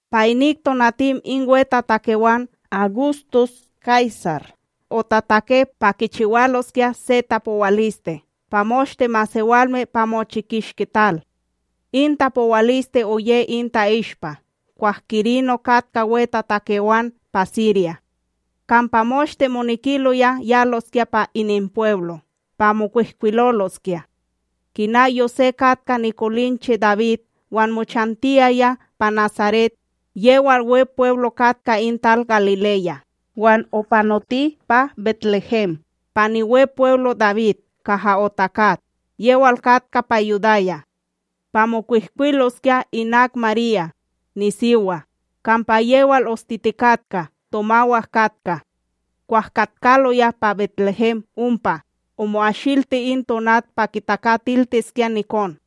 Pa inik tonatim in wetatakewan Awgustus Kaysar otatake pa kichiwaloskya se tapowaliste pa moshte masewalme pa mochi kishki tal. In tapowaliste oye in ta'ishpa kwah Kirino katka wetatakewan pa Sirya. Kampa moshte monekiloya yaloskya pa ininpweblo pa mokwihkwiloloskya. Kina Yosé katka nikolinche Dawid wan mochantiyaya pa Nasaret, yewal Wepweblo katka in tal Galileya, wan opanoti pa BetLéhem, pa niWepweblo Dawid kaha otakat, yewal katka pa Yudaya. Pa mokwihkwiloskya, inak Marya, nisiwa, kampa yewal ostitikatka tomawak katka. Kwah katkaloya pa BetLéhem ompa, omo'ashilti in tonat pa kitakatiltiskya nikon.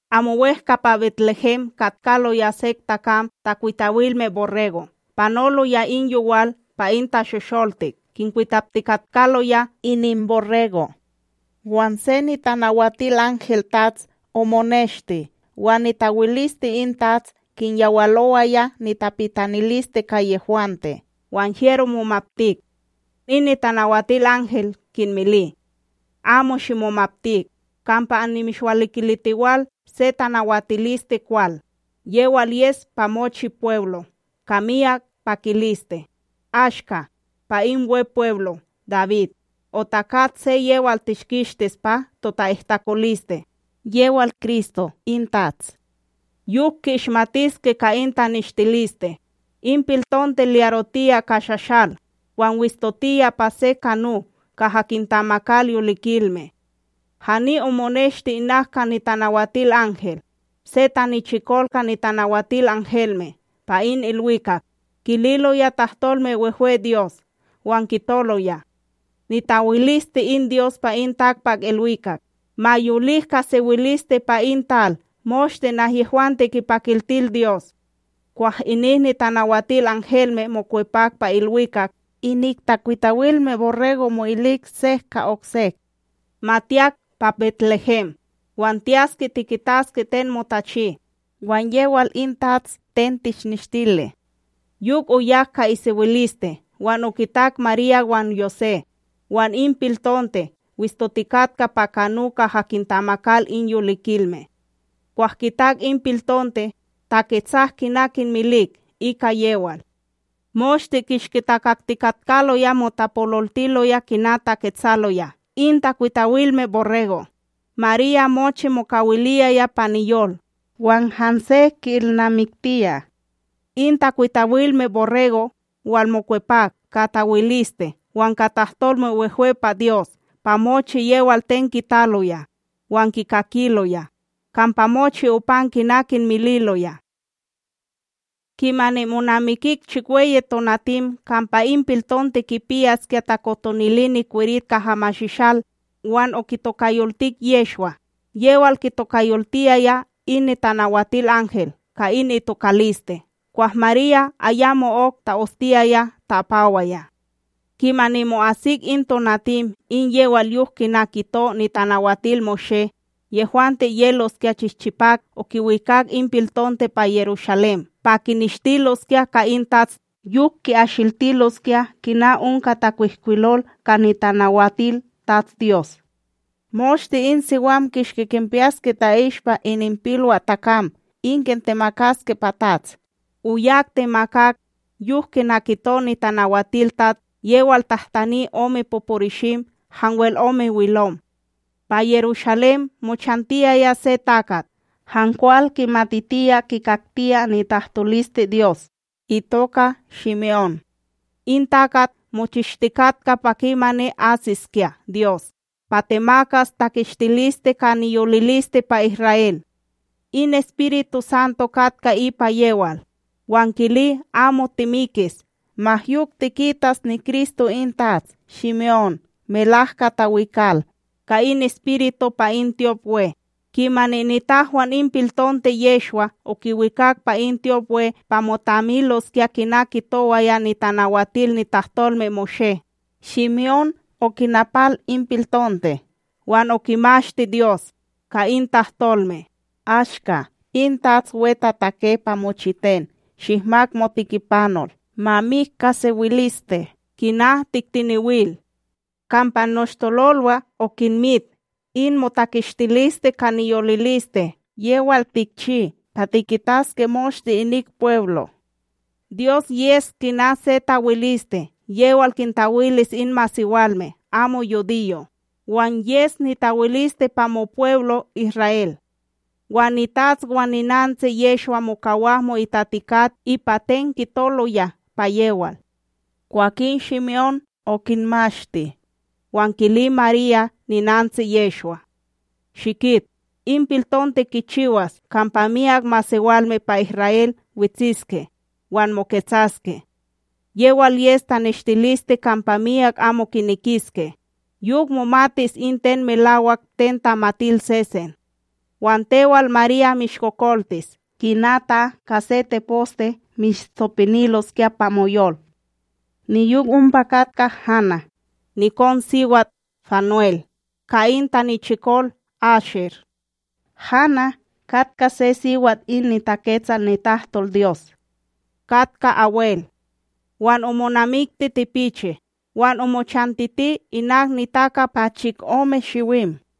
Amo wEhka pa BetLéhem katkaloya sek takam takwitawilme borrego' panoloya in yowal pa in tashosholtik kinkwitaptikatkaloya ininborrego'. Wan se NitanawatilanhelTATS omoneshti, wan nitawiliste in TATS kinyawalowaya nitapitaniliste ka yehwante; wan hyero momaptik. In Nitanawatilanhel kinmili: ―Amo shimomaptik, kampa annimishwalikilitiwal se tanawatiliste kwal, yewal yes pa mochi pweblo ka miyak pakiliste: ashka, pa in Wepweblo Dawid, otakat se yewal tishkishtis pa tota'ihtakoliste, yewal Kristo in TATS. Yok ki'ishmatiske ka in taneshtiliste, in piltonte lyarotiya ka shashal, wan wistotiya pa se kano kaha kintamakal yolikilme. Hani omoneshti inak in Nitanawatilanhel, se tanichikol ka nitanawatilanhelme pa in ilwikak, kililoya tahtolme wehwe Dyos wan kitoloya: Nitawiliste in Dyos pa in takpakIlwikak, ma yolik ka sewiliste pa in tal moshte nahyehwante kipakiltil Dyos! Kwah inik nitanawatilanhelme mokwepak pa ilwikak, inik takwitawilme borrego' mo'ilik sek ka oksek: ―Ma tiyak, pa BetLéhem, wan tiyaske tikitaske ten motachi, wan yewal in TATS ten tishnishtili. Yok oyak ka isewiliste wan okitak Marya wan Yosé, wan in piltonte wistotikatka pa kano kaha kintamakal in yolikilme. Kwah kitak in piltonte, taketsak kina kinmilik ika yewal, moshte kishki takaktikatkaloya motapololtiloya kina taketsaloya in takwitawilme borrego'. Marya mochi mokawiliyaya pa niyol, wan hanse ki'ilnamiktiya. In takwitawilme borrego', walmokwepak ka tawiliste wan ka tahtolme wehwe pa Dyos pa mochi yewal ten kitaloya wan kikakiloya, kampa mochi opan kina kinmililoya. Kimani monamikik chikweyi tonatim kampa in piltonte kipiyaskya takotonili nikwerit kaha mashishal, wan okitokayoltik Yehshwa, yewal kitokayoltiyaya in Nitanawatilanhel ka in itokaliste kwah Marya ayamo'ok ta'ostiyaya ta'apawaya. Kimani mo'asik in tonatim in yewal yok kina kito NitanawatilMoshé, yehwante yeloskya chihchipak okiwikak in piltonte pa Yerushalém pa kineshtiloskya ka in TATS. Yok ki'ashiltiloskya kina onka takwihkwilol ka nitanawatilTATS:a “Moshte in siwan kishki kinpiyaske ta'ishpa ininpilwaTakam in kintemakaske pa TATS.” Oyak temakak, yok kina kito nitanawatilTATS: yewal tahtani ome poporishim hanwel ome wilom. Pa Yerushalém mochantiyaya se takat han kwal kimatitiya kikaktiya nitahtoliste Dyos itoka Shime'ón. In takat mochistikatka pa kimani asiskya Dyos pa temakas takishtiliste ka niyoliliste pa Isra'El. In EspirituSanto katka ipa yewal, wan kili amo timikis ma yok tikitas niKristo in TATS. Shime'ón melahka tawikal, ka in Espiritu pa in tyopWe; kimani nitahwan in piltonte Yehshwa okiwikak pa in tyopWe pa motamiloskya kina kitowaya nitanawatil nitahtolmeMoshé, Shime'ón okinapal in piltonte wan okimashti Dyos, ka in tahtolme: Ashka, in Tats wetatake pa mochiten, shihmak motikipanol ma mik ka sewiliste, kina tiktenewil. Kampa noshtololwa okinmit in motakishtiliste ka niyoliliste yewal tikchi pa tikitaske moshte inik pweblo'. Dyos yes kina se tawiliste yewal kintawilis in masewalme amo yudiyo', wan yes nitawiliste pa mopweblo Isra'El. Wan nitats wan ninantsi Yehshwa mokawak mo'itatikat ipa ten kitoloya pa yewal. Kwakin Shime'ón okinmashti, wan kili Marya ninantsi Yehshwa: ―Shikit, in piltonte kichiwas kampa myak masewalme pa Isra'El wetsiske wan moketsaske. Yewal yes taneshtiliste kampa myak amo kinekiske, yok momatis in ten melawak ten tamatil sesen. Wan tewal Marya mishkokoltis kina ta ka se teposte mishtsopiniloskya pa moyol. Niyok ompa katka Hana, nikonSiwat Fanuel, ka in tanichikol Asher. Hana katka se siwat in niTaketsal nitahtolDyos katka abwel. Wan omonamikti tipichi, wan omochantiti inak nitaka pa chikome shiwim,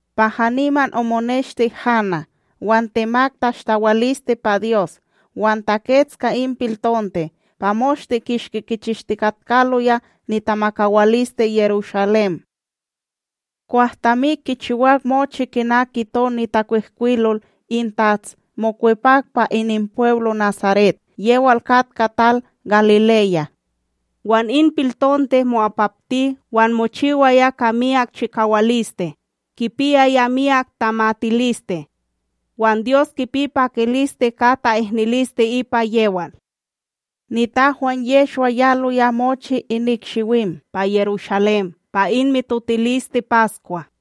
Pa haniman omoneshti Hana, wan temak tashtawaliste pa Dyos wan takets ka in piltonte pa moshte kishki kichishtikatkaloya nitamakawaliste Yerushalém. Kwah tamik kichiwak mochi kina kito nitakwihkwilol in TATS, mokwepak pa ininpweblo Nasaret, yewal katka tal Galileya. Wan in piltonte mo'apapti wan mochiwaya ka miyak chikawaliste, kipiyaya miyak tamatiliste wan Dyos kipi pakiliste ka ta'ihniliste ipa yewal. Nitahwan Yehshwa yaloya mochi inik shiwim pa Yerushalém pa in mitotiliste Paskwa.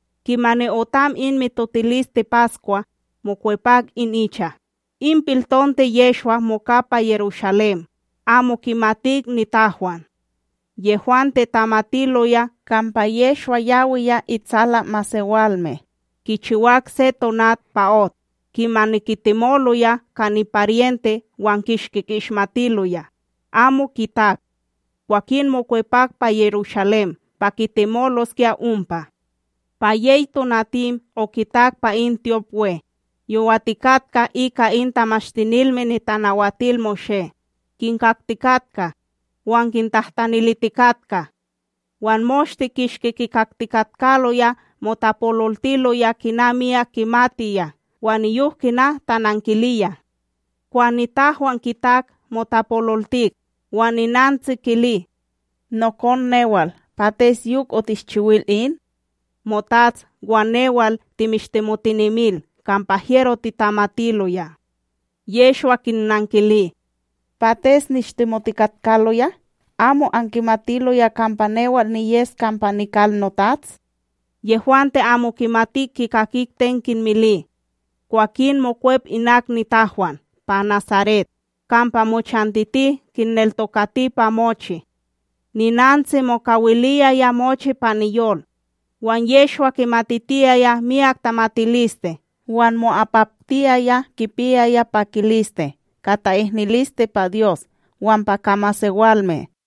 Kimani otam in mitotiliste Paskwa, mokwepak in icha, in piltonte Yehshwa moka pa Yerushalém, amo kimatik nitahwan. Yehwante tamatiloya kampa Yehshwa yawiya itsala masewalme, kichiwak se tonat pa ot; kimani kitemoloya ka niparyente wan kishki ki'ishmatiloya, amo kitak. Kwakin mokwepak pa Yerushalém pa kitemoloskya ompa. Pa yey tonatim okitak pa in tyopWe, yowatikatka ika in Tamashtinilme NitanawatilMoshé, kinkaktikatka wan kintahtanilitikatka. Wan moshte kishki kikaktikatkaloya motapololtiloya kina miyak kimatiya wan niyok kina tanankiliya. Kwah nitahwan kitak, motapololtik; wan ninantsi kili: ―Nokon newal, pates yok otishchiwil in? Motats wan newal timishtemotinemil kampa hyero titamatiloya. Yehshwa kinnankili: ―Pates nishtemotikatkaloya? Amo ankimatiloya kampa newal niyes kampa nikal noTats? Yehwante amo kimatik kikakik ten kinmili. Kwakin mokwep inak nitahwan pa Nasaret, kampa mochantiti kinneltokati pa mochi. Ninantsi mokawiliyaya mochi pa niyol. Wan Yehshwa kimatitiyaya miyak tamatiliste wan mo'apaptiyaya, kipiyaya pakiliste ka ta'ihniliste pa Dyos wan pa ka masewalme.